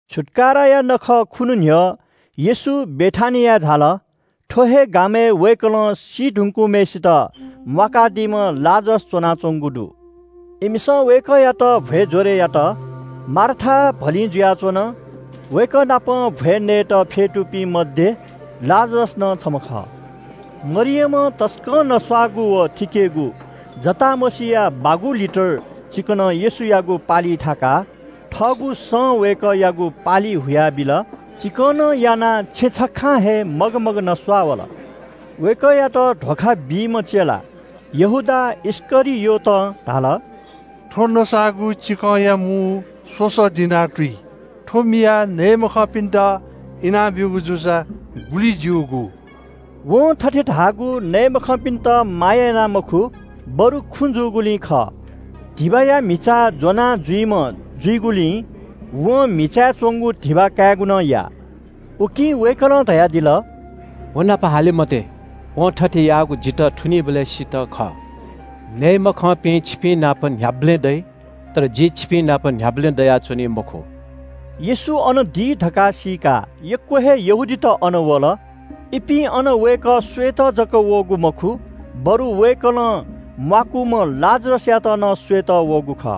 छुत्‍काराया नखःया खुन्‍हु न्‍ह्यः येशू बेथानियाय् झाल। थ्‍व हे गामय् वय्‌कलं सी धुंकूम्‍हय्‌सित म्‍वाकादीम्‍ह लाजरस च्‍वनाच्‍वंगु दु। इमिसं वय्‌कःयात भ्‍वय् ज्‍वरय् यात। मार्था भलिं जुयाच्‍वन। वय्‌कःनापं भ्‍वय् नयेत फ्‍यतुपिं मध्‍ये लाजरस नं छम्‍ह खः। मरियमं तसकं नस्‍वाःगु व थिकेगु जटामसीया बागू लिटर चिकनं येशूयागु पालिइ थाकाः थःगु सं वय्‌कःयागु पालि हुयाबिल। चिकनं यानाः छेँ छखां हे मगमग नस्‍वाः वल। वय्‌कःयात धोखा बीम्‍ह चेला यहूदा इस्‍करियोतं धाल – “थ्‍व नस्‍वाःगु चिकंया मू स्‍वसः दिनार तुइ। थ्‍व मियाः नये मखंपिन्‍त इनाब्‍यूगु जूसा गुलि ज्‍यूगु।” वं थथे धाःगु नये मखंपिन्‍त माया याना मखु, बरु खुँ जूगुलिं खः। धिबाया म्‍हिचा ज्‍वनाजुइम्‍ह जुइगुलिं वं म्‍हिचाय् च्‍वंगु धिबा कायेगु नं याः। उकिं वय्‌कलं धयादिल – “व नाप हाले मते। वं थथे याःगु जितः थुनीबलय्‌सित खः। नये मखंपिं छिपिंनाप न्‍ह्याबलें दइ, तर जि छिपिंनाप न्‍ह्याबलें दयाच्‍वनी मखु।” येशू अन दी धकाः सीकाः यक्‍व हे यहूदीत अन वल। इपिं अन वय्‌कः स्‍वयेत जक वःगु मखु, बरु वय्‌कलं म्‍वाकूम्‍ह लाजरसयात नं स्‍वयेत वःगु खः।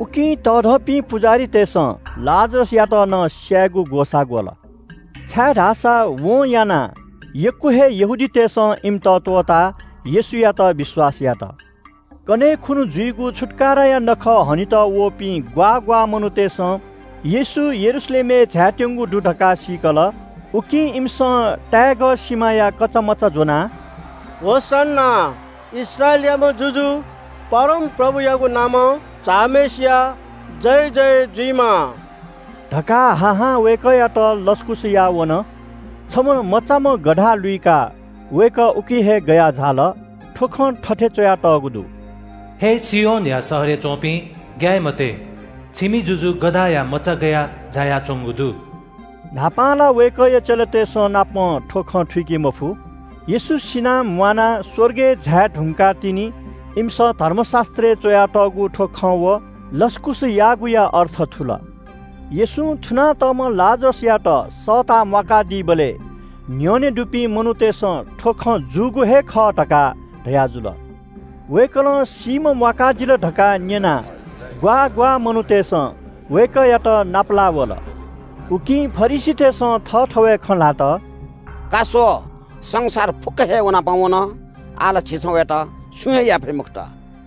उकिं तःधंपिं पुजाहारीतय्‌सं लाजरसयात नं स्‍यायेगु ग्‍वसाः ग्‍वल, छाय्‌धाःसा वं यानाः यक्‍व हे यहूदीतय्‌सं इमित त्‍वःताः येशूयात विश्‍वास यात। कन्‍हय् खुन्‍हु जुइगु छुत्‍काराया नखः हनेत वःपिं ग्‍वाः ग्‍वाः मनूतय्‌सं येशू यरूशलेमय् झायात्‍यंगु दु धकाः सीकल। उकिं इमिसं ताय्‌गः सिमाया कचामचा ज्‍वनाः– “होसन्‍ना, इस्राएलयाम्‍ह जुजु परमप्रभुयागु नामं झाःम्‍हय्‌सिया जयजय जुइमा” धकाः हा हां वय्‌कःयात लसकुस याः वन। छम्‍ह मचाम्‍ह गधा लुइकाः वय्‌कः उकी हे गयाः झाल। थ्‍व खँ थथे च्‍वयातःगु दु – “हे सियोनया शहरय् च्‍वपिं, ग्‍याये मते, छिमि जुजु गधाया मचा गयाः झायाच्‍वंगु दु।” न्‍हापां ला वय्‌कःया चेलातय्‌संनापं थ्‍व खँ थुइके मफु। येशू सिनाः म्‍वानाः स्‍वर्गय् झाये धुंकाः तिनि इमिसं धर्मशास्‍त्रय् च्‍वयातःगु थ्‍व खँ व लसकुस याःगुया अर्थ थुल। येशूं थुना तःम्‍ह लाजरसयात सःताः म्‍वाकादीबलय् न्‍ह्यःने दुपिं मनूतय्‌सं थ्‍व खँ जूगु हे खः धकाः धयाजुल। वय्‌कलं सीम्‍ह म्‍वाकादिल धकाः न्‍यनाः ग्‍वाः ग्‍वाः मनूतय्‌सं वय्‌कःयात नापलाः वल। उकिं फरिसीतय्‌सं थःथवय् खँ ल्‍हात– “का स्‍व, संसार फुक्‍क हे व नाप वन। आः ला झीसं वयात छुं हे याये फइ मखुत।”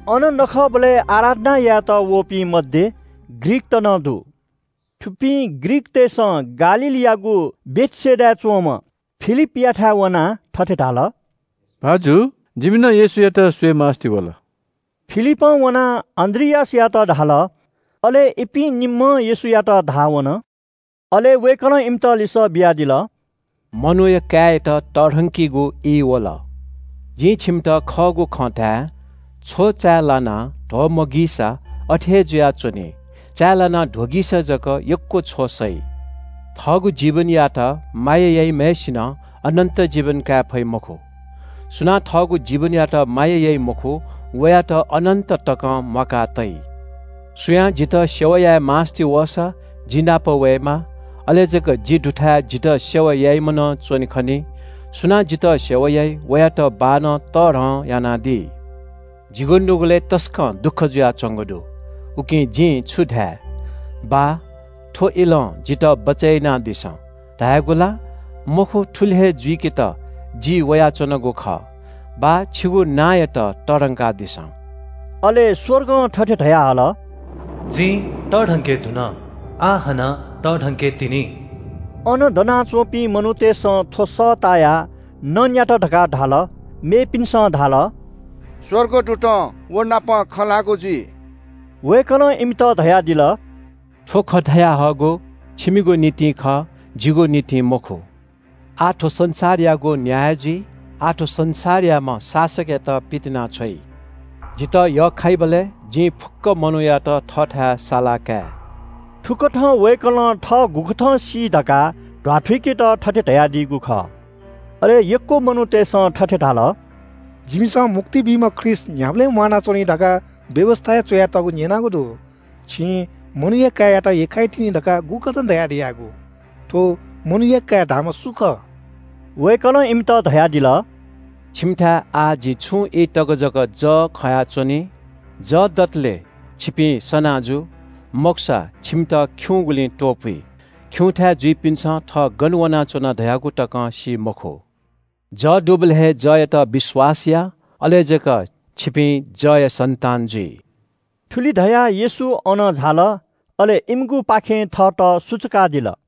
अन नखःबलय् आराधना यायेत वःपिं मध्‍ये ग्रीकत नं दु। थुपिं ग्रीकतय्‌सं गालीलयागु बेथसेदाय् च्‍वंम्‍ह फिलिपयाथाय् वनाः थथे धाल – “भाजु, जिमि नं येशूयात स्‍वयेमास्‍ति वल।” फिलिपं वनाः अन्‍द्रियासयात धाल। अले इपिं निम्‍हं येशूयात धाः वन। अले वय्‌कलं इमित लिसः बियादिल – “मनूया काय्‌यात तःधंकीगु ई वल। जिं छिमित खःगु खँ धाये – छ्व चाय् लानाः ध्‍वमगीसा छगः हे जुयाच्‍वनी, चाय् लानाः ध्‍वगीसा जक यक्‍व छ्व सइ। थःगु जीवनयात माया याइम्‍हय्‌सिनं अनन्‍त जीवन काये फइ मखु। सुनां थःगु जीवनयात माया याइ मखु, वयात अनन्‍त तकं म्‍वाका तइ। सुयां जितः सेवा याये मास्‍ति वःसा जि नाप वयेमाः। अले जक जि दुथाय् जितः सेवा याइम्‍ह नं च्‍वने खनी। सुनां जितः सेवा याइ वयात बाःनं तःधं यानादी। “जिगु नुगलय् तसकं दुःख जुयाच्‍वंगु दु। उकिं जिं छु धाये? ‘बाः, थ्‍व इलं जितः बचय् यानादिसँ’ धायेगु ला? मखु, थुलि हे जुइकेत जि वयाच्‍वनागु खः। ‘बाः, छिगु नांयात तःधंकादिसँ।’” अले स्‍वर्गं थथे धयाहल – “जिं तःधंके धुन, आः हानं तःधंके तिनि।” अन दनाच्‍वंपिं मनूतय्‌सं थ्‍व सः तायाः नँ न्‍यात धकाः धाल। मेपिन्‍सं धाल – “स्‍वर्गदूतं व नाप खँ ल्‍हाःगु जुइ।” वय्‌कलं इमित धयादिल – “थ्‍व खँ धयाहःगु छिमिगु निंतिं खः, जिगु निंतिं मखु। आः थ्‍व संसारयागु न्‍याय जुइ। आः थ्‍व संसारयाम्‍ह शासकयात पितिनाछ्वइ। जितः यख्‍खाइबलय् जिं फुक्‍क मनूयात थःथाय् सालाकाये।” थुकथं वय्‌कलं थः गुकथं सी धकाः ध्‍वाथुइकेत थथे धयादीगु खः। अले यक्‍व मनूतय्‌सं थथे धाल – “जिमिसं मुक्ति बीम्‍ह ख्रीष्‍ट न्‍ह्याबलें म्‍वानाच्‍वनी धकाः व्‍यवस्‍थाय् च्‍वयातःगु न्‍यनागु दु। छिं मनूया काय्‌यात यख्‍खाइ तिनि धकाः गुकथं धयादियागु? थ्‍व मनूया काय् धाःम्‍ह सु खः?” वय्‌कलं इमित धयादिल – “छिकपिन्‍थाय् आः छुं ई तक जक जः खयाच्‍वनी, जः दतले छिकपिं सना जु, मखुसा छिकपिन्‍त खिउँगुलिं त्‍वपुइ। खिउँथाय् जुइपिन्‍सं थः गन वनाच्‍वना धयागु तकं सी मखु। जः दुबलय् हे जःयात विश्‍वास या। अले जक छिपिं जःया सन्‍तान जुइ।” थुलि धयाः येशू अन झाल अले इमिगुपाखें थःत सुचुकादिल।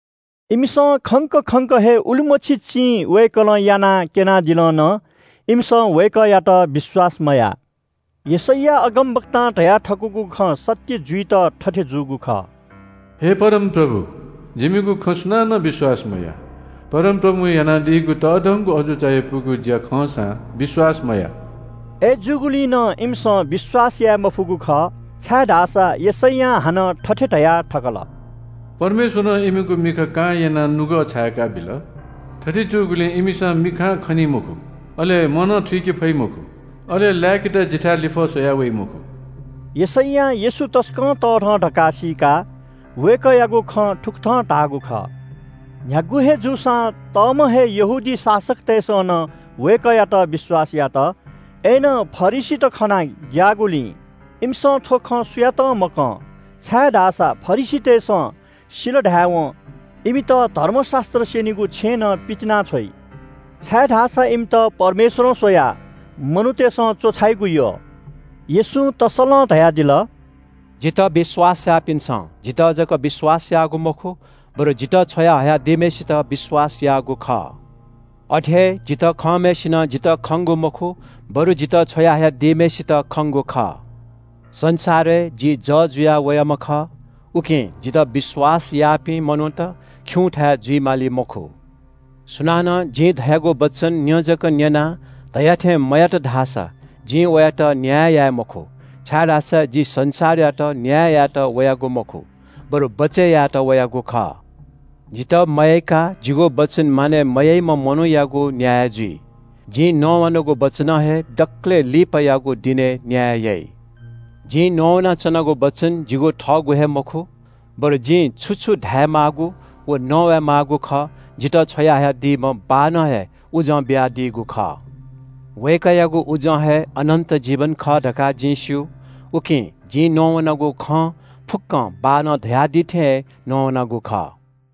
इमिसं खंक खंक हे उलिमछि चिं वय्‌कलं यानाः क्‍यनादिल नं इमिसं वय्‌कःयात विश्‍वास मयाः। यशैया अगमवक्तां धयाथकूगु खँ सत्‍य जुइत थथे जूगु खः – “हे परमप्रभु, जिमिगु खँ सुनानं विश्‍वास मयाः। परमप्रभुं यानादीगु तःधंगु अजू चायापुगु ज्‍या खंसां विश्‍वास मयाः।” अय्‌जूगुलिं नं इमिसं विश्‍वास याये मफुगु खः, छाय्‌धाःसा यशैयां हानं थथे धया थकल – “परमेश्‍वरं इमिगु मिखा कां यानाः नुगः छाय्‌का बिल। थथे जूगुलिं इमिसं मिखां खनी मखु, अले मनं थुइके फइ मखु, अले लाय्‌केत जिथाय् लिफः स्‍वयाः वइ मखु।” यशैयां येशू तसकं तःधं धकाः सीकाः वय्‌कःयागु खँ थुकथं धाःगु खः। न्‍ह्यागु हे जूसां तःम्‍ह हे यहूदी शासकतय्‌सं नं वय्‌कःयात विश्‍वास यात। अय्‌नं फरिसीत खनाः ग्‍याःगुलिं इमिसं थ्‍व खँ सुयातं मकं, छाय्‌धाःसा फरिसीतय्‌सं सिल धायेवं इमित धर्मशास्‍त्र स्‍यनीगु छेँनं पितिनाछ्वइ। छाय्‌धाःसा इमित परमेश्‍वरं स्‍वयाः मनूतय्‌सं च्‍वछाइगु यः। येशूं तस्‍सलं धयादिल – “जितः विश्‍वास याःपिन्‍सं जितः जक विश्‍वास याःगु मखु, बरु जितः छ्वया हयादीम्‍हय्‌सित विश्‍वास याःगु खः। अथे हे जितः खंम्‍हय्‌सिनं जितः खंगु मखु, बरु जितः छ्वया हयादीम्‍हय्‌सित खंगु खः। संसारय् जि जः जुया वयाम्‍ह खः, उकिं जितः विश्‍वास याःपिं मनूत खिउँथाय् जुइ माली मखु। सुनानं जिं धयागु वचन न्‍यँ जक न्‍यनाः धया थें मयात धाःसा जिं वयात न्‍याय याये मखु, छाय्‌धाःसा जि संसारयात न्‍याय यायेत वयागु मखु, बरु बचय् यायेत वयागु खः। जितः मयय्‌काः जिगु वचन मानय् मयाइम्‍ह मनूयागु न्‍याय जुइ। जिं नवानागु वचनं हे दकलय् लिपायागु दिनय् न्‍याय याइ। जिं नवानाच्‍वनागु वचन जिगु थःगु हे मखु, बरु जिं छु छु धायेमाःगु व नवाये माःगु खः जितः छ्वयाहयादीम्‍ह बाःनं हे उजं बियादीगु खः। वय्‌कःयागु उजं हे अनन्‍त जीवन खः धकाः जिं स्‍यू, उकिं जिं नवानागु खँ फुक्‍कं बाःनं धयादी थें हे नवानागु खः।”